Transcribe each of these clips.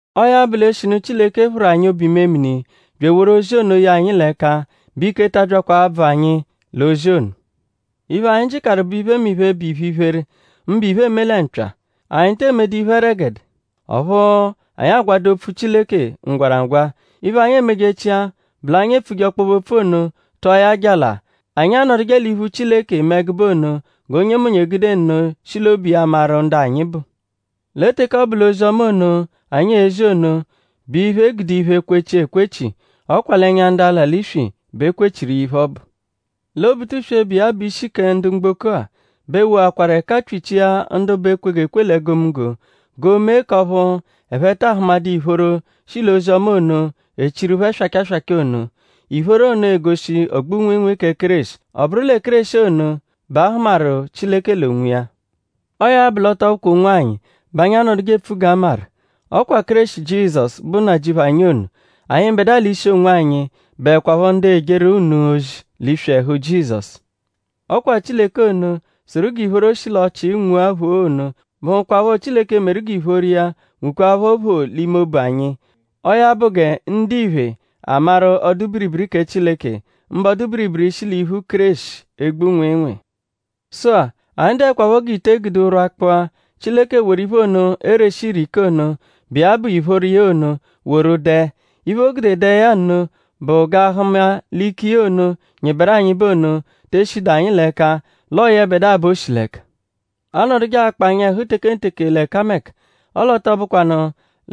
Ọo ya bụ; l'eshinu Chileke phụru anyi obu-imemini bya eworu ozi ono ye anyi l'ẹka bẹ ike ta abyakwa abvụ anyi l'ozi ono. Iphe, anyi jịkaru bụ iphemiphe, bụ iphe-iphere; mbụ iphe, eeme lẹ mpya. Anyi te emedu iphe ẹregede; ọphu anyi agwadu opfu Chileke ngwaragwa. Iphe, anyi emejechia bụ l'anyi epfuje ọkpobe-opfu ono tụa ya jala. Anyi anọduje l'iphu Chileke eme ẹgube ono g'onyemonye egude nno shi l'obu iya maru ndu anyi bụ. Lẹ teke ọ bụ l'ozi-ọma ono, anyi ezi ono bụ iphe, e gude iphe kwechia ekwechi; ọ kwa l'ẹnya ndu ala l'iswi bẹ e kwechiru iya iphe ọbu. Lẹ Obutuswe, bụ iya bụ ishi kẹ ndu mgboko-a bẹ woakwaru ẹka pyichia ndu bụ ekwegekwe l'egomunggo g'o mee k'ọphu ẹphe taa hụmadu ìphóró, shi l'ozi-ọma ono, echiru phẹ swacha swacha ono. Ìphóró ono egoshi ogbu-nwịinwii kẹ Kéreshi. Ọ bụru lẹ Kéreshi ono bẹ a hụmaru Chileke l'onwiya. Ọo ya bụ; l'ọ tọ bụkwa onwanyi bẹ anyi anọduje epfu g'a maru. Ọ kwa Kéreshi Jizọsu, bụ Nnajịuphu anyi ono. Anyịbedua l'ishi onwanyi bụekwapho ndu ejeru unu ozi l'iswi ẹhu Jizọsu. Ọ kwa Chileke ono, sụru g'ìphóró shi l'ọchii nwua phoo ono bụhukwapho Chileke, meru g'ìphóró iya nwukwaaphọ phoo l'ime obu anyi. Ọo ya bụ gẹ ndiphe, amaru ọdu-biribiri kẹ Chileke; mbụ ọdu-biribiri, shi l'iphu Kéreshi egbu nwịinwii. Sụ-a; anyi dụekwapho g'ite, e gude ụrwa kpụa, Chileke woru iphe ono, ereshi ire ike ono, bụ iya bụ ìphóró iya ono woru dẹe. Iphe, o gude dẹe ya nno bụ g'a hụma l'ike iya ono, nyịberu anyịbe ono te eshidu anyi l'ẹka; l'ọo yẹbedua bẹ o shi l'ẹka. Aanọduje akpa anyị ẹhu tekenteke l'ẹkameka; ọle ọ tọ bụkwanu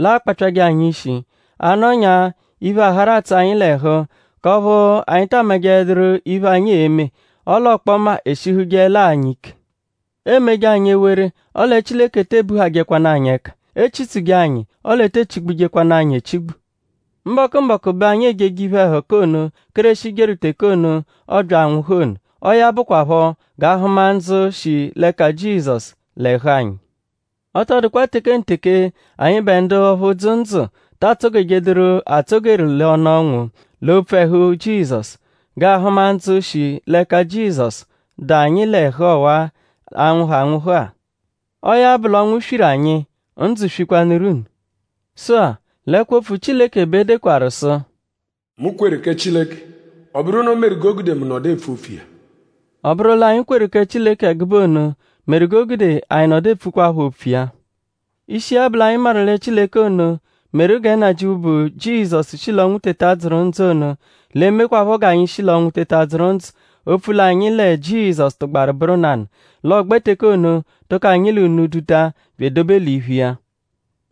l'aakpapyajẹ anyi ishi. A -nọnyaa iphe, aharu atsụ anyi l'ẹhu k'ọphu anyi taa majẹeduru iphe, anyi e-me; ọle ọkpoma eshihujeẹla anyi ike. Eemeje anyi ewere; ọle Chileke te ebuhajẹkwanu anyi ẹka. E chitsuje anyi; ọle e te echigbujekwanụ anyi echigbu. Mbọku-mbọku bẹ anyi ejeje iphe-ẹhuka ono, Kéreshi jeru teke ono, ọobya anwụhu ono. Ọo ya bụkwapho g'aa-hụma ndzụ, shi l'ẹka Jizọsu l'ẹhu anyi. Ọ tọ dụkwa tekenteke anyịbe ndu ọphu dzụ ndzụ ta atsọ-gejeduru atsọ-geru l'ọnu ọnwu; l'opfu ẹhu Jizọsu; g'aa-hụma ndzụ, shi l'ẹka Jizọsu, dụ anyi l'ẹhu ọwa-a, a-nwụhu anwụhu-a. Ọo ya bụ l'ọnwu swiru anyi; ndzụ swikwanụru unu. Sụ-a; l'ẹkwo-opfu Chileke bẹ e dekwaru sụ: “Mu kweru kẹ Chileke. Ọ bụru iphe ono meru g'o gude mu nọdu epfu opfu iya.” Ọ bụru l'anyi kweru kẹ Chileke ẹgube ono meru g'o gude anyi nọdu epfukwaphọ opfu iya. Ishi iya bụ l'anyi maru lẹ Chileke ono, meru gẹ Nnajịuphu, bụ Jizọsu shi l'ọnwu teta dzụru ndzụ ono l'e-mekwaphọ g'anyi shi l'ọnwu teta dzụru ndzụ opfu l'anyi lẹ Jizọsu tụgbaru bụru nanụ; l'ọogbe teke ono tụko anyi l'unu duta bya edobe l'iphu iya.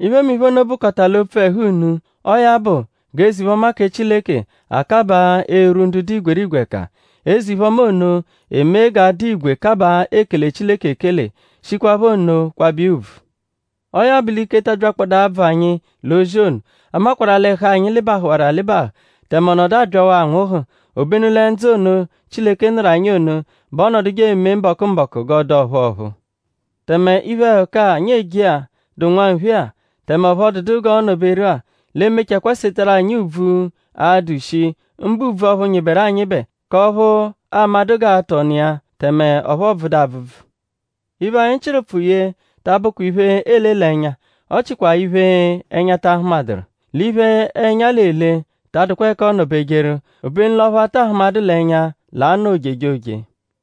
Iphemiphe ono bụkota l'opfu ẹhu unu. Ọo ya bụ g'eze-iphe-ọma kẹ Chileke akabaa erwu ndu dụ igwerigwe ẹka. Eze-iphe-ọma ono emee g'a dụ igwe kabaa ekele Chileke ekele; shikwaphọ nno kwabẹ iya ùbvù. Ọo ya bụ l'ike ta abyakpọda abvụ anyi l'ozi ono. A makwarụ-a l'ẹhu anyi lịbahuwaru alịbahu tẹme ọ nọdu abyawaa anwụhu; obenu lẹ ndzụ ono, Chileke nụru anyi ono bẹ ọonoduje eme mbọku-mbọku g'ọ dụ ọ̀phúú ọ̀phúú. Tẹme iphe-ẹhuka, anyi eje-a, dụ nwanphe-a; tẹme ọphu ọ dụdu g'ọo-nọ-beru-a; l'e-mechakwaa setarụ anyi ùbvù, a-dụ shi; mbụ ùbvù ọphu nyịberu anyịbe k'ọphu aamadụ g'aatụ ọnu iya; tẹme ọphu ọ bvụdu abvụbvu. Iphe, anyi chịru ụpfu ye ta abụkwa l'iphe, eele l'ẹnya; ọ chikwa l'iphe, ẹnya ta ahụmaduru. L'iphe, ẹnya l'ele ta adụkwa ẹka ọono-bejeru; obenu l'ọphu a ta ahụmadu l'ẹnya l'a-nọ ojejoje.